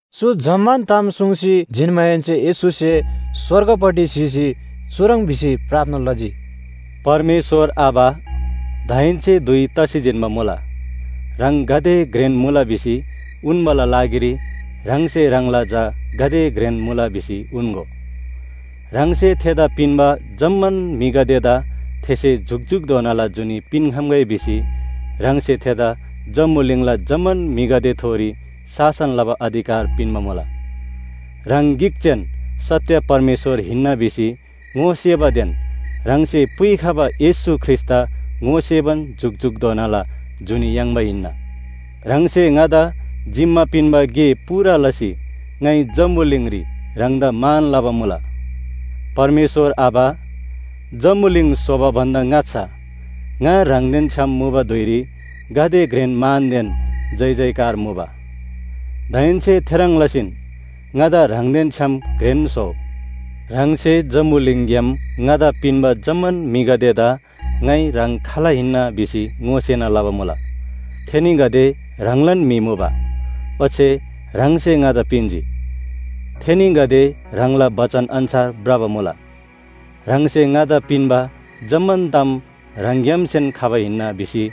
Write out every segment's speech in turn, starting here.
चु जम्‍मान ताम सुङ्सी जिन्‍माहेन्‍से येशूसे स्‍वर्गपट्टि स्‍हीसी चुह्रङ् भिसी प्रार्थना लजी, “परमेश्‍वर आबा, दाहेन्‍से धुइ तसी जिन्‍बा मुला। ह्राङ गाते घ्रेन मुला भिसी उन्‍बाला लागिरी ह्राङसे ह्राङला झा गाते घ्रेन मुला भिसी उन्‍गो। ह्राङसे थेदा पिन्‍बा जम्‍मान म्‍हिगदेदा थेसे जुकजुकधोनाला जुनी पिन्‍खम्‍गै भिसी ह्राङसे थेदा जम्‍बुलिङला जम्‍मान म्‍हिगदेथोरी शासन लबा अधिकार पिन्‍बा मुला। ह्राङ गिक जेन सत्‍य परमेश्‍वर हिन्‍ना भिसी ङोसेबादेन ह्राङसे पुइखबा येशू ख्रीष्‍टदा ङोसेबान जुकजुकधोनाला जुनी याङ्बा हिन्‍ना। ह्राङसे ङादा जिम्‍मा पिन्‍बा गे पूरा लसी ङाइ जम्‍बुलिङरी ह्राङदा मान लबा मुला। परमेश्‍वर आबा, जम्‍बुलिङ स्‍होबा भन्‍दा ङाच्‍छा ङा ह्राङदेन छ्‌याम मुबा धुइरी गाते घ्रेन मानदेन जयजयकार मुबा। दाहेन्‍से थेह्रङ् लसीन ङादा ह्राङदेन छ्‌याम घ्रेन स्‍होउ। “ह्राङसे जम्‍बुलिङग्‍याम ङादा पिन्‍बा जम्‍मान म्‍हिगदेदा ङाइ ह्राङ खाल हिन्‍ना भिसी ङोसेना लबा मुला। थेनीगदे ह्राङलान म्‍हि मुबा, ओच्‍छे ह्राङसे ङादा पिन्‍जी। थेनीगदे ह्राङला बचन अन्‍छार भ्रबा मुला। ह्राङसे ङादा पिन्‍बा जम्‍मान ताम ह्राङग्‍यामसेन खबा हिन्‍ना भिसी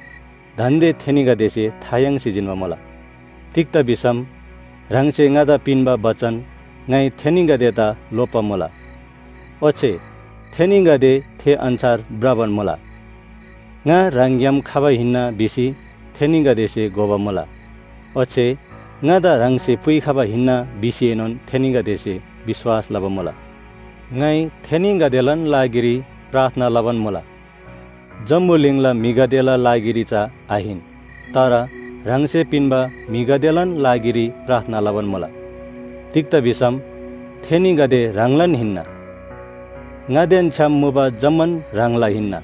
दान्‍दे थेनीगदेसे था याङ्सी जिन्‍बा मुला। तिग्‍दा भिसम ह्राङसे ङादा पिन्‍बा बचन ङाइ थेनीगदेदा लोप्‍बा मुला, ओच्‍छे थेनीगदे थे अन्‍छार भ्रबान मुला। ङा ह्राङग्‍याम खबा हिन्‍ना भिसी थेनीगदेसे घोबा मुला, ओच्‍छे ङादा ह्राङसे पुइखबा हिन्‍ना भिसीएनोन थेनीगदेसे विश्‍वास लबा मुला। “ङाइ थेनीगदेलान लागिरी प्रार्थना लबान मुला, जम्‍बुलिङला म्‍हिगदेला लागिरी चा आहिन। तर ह्राङसे पिन्‍बा म्‍हिगदेलान लागिरी प्रार्थना लबान मुला, तिग्‍दा भिसम थेनीगदे ह्राङलान हिन्‍ना। ङादेन छ्‌याम मुबा जम्‍मान ह्राङला हिन्‍ना,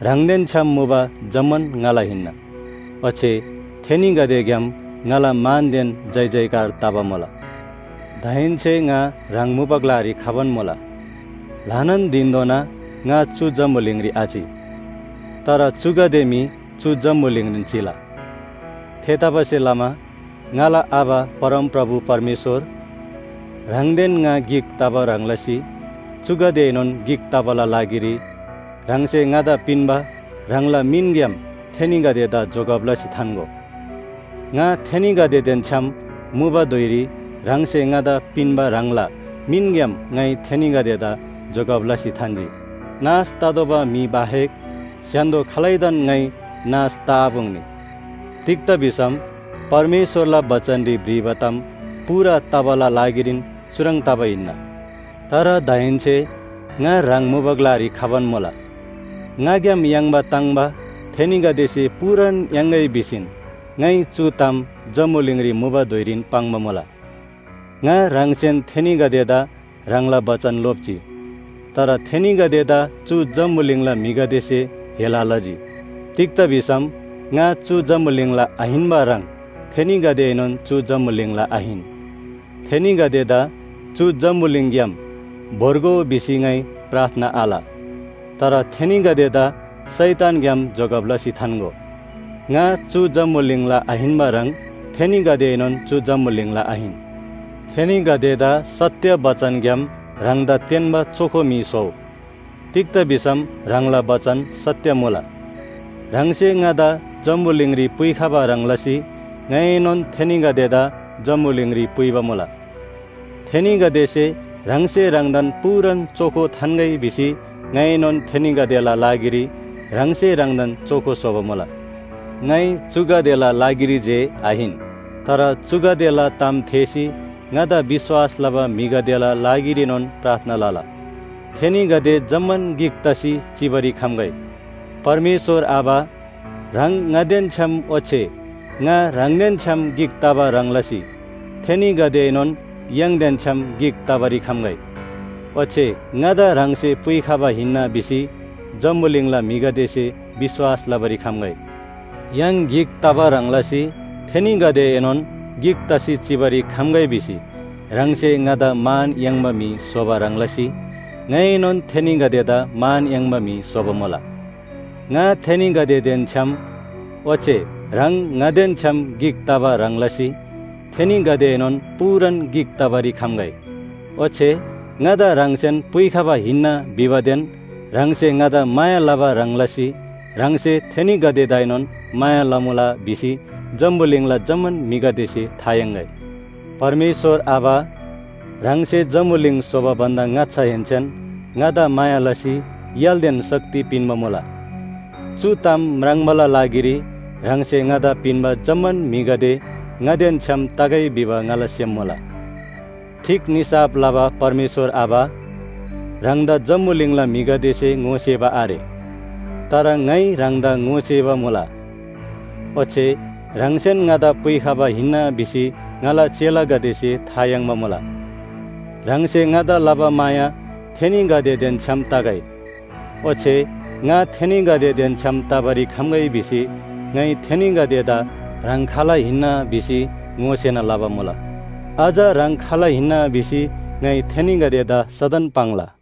ह्राङदेन छ्‌याम मुबा जम्‍मान ङाला हिन्‍ना। ओच्‍छे थेनीगदेग्‍याम ङाला मानदेन जयजयकार तबा मुला। “दाहेन्‍से ङा ह्राङ मुबा ग्‍लारी खबान मुला। ल्‍हानान धिनधोना ङा चु जम्‍बुलिङरी आचि, तर चुगदे मी चु जम्‍बुलिङरीन चिला। थेतबासेलमा ङाला आबा परमप्रभु परमेश्‍वर, ह्राङदेन ङा गिक तबा ह्रङ् लसी चुगदेएनोन गिक तबाला लागिरी ह्राङसे ङादा पिन्‍बा ह्राङला मिनग्‍याम थेनीगदेदा जोगब लसी थान्‍गो। ङा थेनीगदेदेन छ्‌याम मुबा धुइरी ह्राङसे ङादा पिन्‍बा ह्राङला मिनग्‍याम ङाइ थेनीगदेदा जोगब लसी थान्‍जी। नाश ततोःबा म्‍हि बाहेक स्‍य्‍हान्‍दो खालैदान ङाइ नाश तआपुङ्नी। तिग्‍दा भिसम परमेश्‍वरला बचनरी भ्रिबा ताम पूरा तबाला लागिरीन चुह्रङ् तबा हिन्‍ना। “तर दाहेन्‍से ङा ह्राङ मुबा ग्‍लारी खबान मुला। ङाग्‍याम याङ्बा ताङ्‍बा थेनीगदेसे पूरान याङ्‌गै भिसीन ङाइ चु ताम जम्‍बुलिङरी मुबा धुइरीन पाङ्बा मुला। ङा ह्राङसेन थेनीगदेदा ह्राङला बचन लोप्‍जी। तर थेनीगदेदा चु जम्‍बुलिङला म्‍हिगदेसे हेला लजी। तिग्‍दा भिसम ङा चु जम्‍बुलिङला आहिन्‍बा ह्रङ् थेनीगदेएनोन चु जम्‍बुलिङला आहिन। थेनीगदेदा चु जम्‍बुलिङग्‍याम भोर्गो भिसी ङाइ प्रार्थना आल, तर थेनीगदेदा शैतानग्‍याम जोगब लसी थान्‍गो। ङा चु जम्‍बुलिङला आहिन्‍बा ह्रङ् थेनीगदेएनोन चु जम्‍बुलिङला आहिन। थेनीगदेदा सत्‍य बचनग्‍याम ह्राङदा तेन्‍बा चोखो म्‍हि स्‍होउ। तिग्‍दा भिसम ह्राङला बचन सत्‍य मुला। ह्राङसे ङादा जम्‍बुलिङरी पुइखबा ह्रङ् लसी ङाइएनोन थेनीगदेदा जम्‍बुलिङरी पुइबा मुला। थेनीगदेसे ह्राङसे ह्राङदान पूरान चोखो थान्‍गै भिसी ङाइनोन थेनीगदेला लागिरी ह्राङसे ह्राङदान चोखो स्‍होबा मुला। “ङाइ चुगदेला लागिरी जे आहिन, तर चुगदेला ताम थेःसी ङादा विश्‍वास लबा म्‍हिगदेला लागिरीनोन प्रार्थना लला। थेनीगदे जम्‍मान गिक तसी चिबारी खम्‍गै। परमेश्‍वर आबा, ह्राङ ङादेन छ्‌याम ओच्‍छे ङा ह्राङदेन छ्‌याम गिक तबा ह्रङ् लसी थेनीगदेएनोन य्‍हाङदेन छ्‌याम गिक तबारी खम्‍गै। ओच्‍छे ङादा ह्राङसे पुइखबा हिन्‍ना भिसी जम्‍बुलिङला म्‍हिगदेसे विश्‍वास लबारी खम्‍गै। य्‍हाङ गिक तबा ह्रङ् लसी थेनीगदेएनोन गिक तसी चिबारी खम्‍गै भिसी ह्राङसे ङादा मान याङ्बा म्‍हि स्‍होबा ह्रङ् लसी ङाइएनोन थेनीगदेदा मान याङ्बा म्‍हि स्‍होबा मुला। ङा थेनीगदेदेन छ्‌याम ओच्‍छे ह्राङ ङादेन छ्‌याम गिक तबा ह्रङ् लसी थेनीगदेएनोन पूरान गिक तबारी खम्‍गै। ओच्‍छे ङादा ह्राङसेन पुइखबा हिन्‍ना भिबादेन ह्राङसे ङादा माया लबा ह्रङ् लसी ह्राङसे थेनीगदेदाएनोन माया लमुला भिसी जम्‍बुलिङला जम्‍मान म्‍हिगदेसे था याङ्‌गै। “परमेश्‍वर आबा, ह्राङसे जम्‍बुलिङ स्‍होबा भन्‍दा ङाच्‍छाहेन्‍सेन ङादा माया लसी य्‍हालदेन शक्ति पिन्‍बा मुला। चु ताम म्राङ्बाला लागिरी ह्राङसे ङादा पिन्‍बा जम्‍मान म्‍हिगदे ङादेन छ्‌याम तगै भिबा ङाला सेम मुला। “ठीक निसाफ लबा परमेश्‍वर आबा, ह्राङदा जम्‍बुलिङला म्‍हिगदेसे ङोसेबा आरे, तर ङाइ ह्राङदा ङोसेबा मुला। ओच्‍छे ह्राङसेन ङादा पुइखबा हिन्‍ना भिसी ङाला चेलागदेसे था याङ्बा मुला। ह्राङसे ङादा लबा माया थेनीगदेदेन छ्‌याम तगै, ओच्‍छे ङा थेनीगदेदेन छ्‌याम तबारी खम्‍गै भिसी ङाइ थेनीगदेदा ह्राङ खाल हिन्‍ना भिसी ङोसेना लबा मुला। अझ ह्राङ खाल हिन्‍ना भिसी ङाइ थेनीगदेदा सदन पाङ्ला।”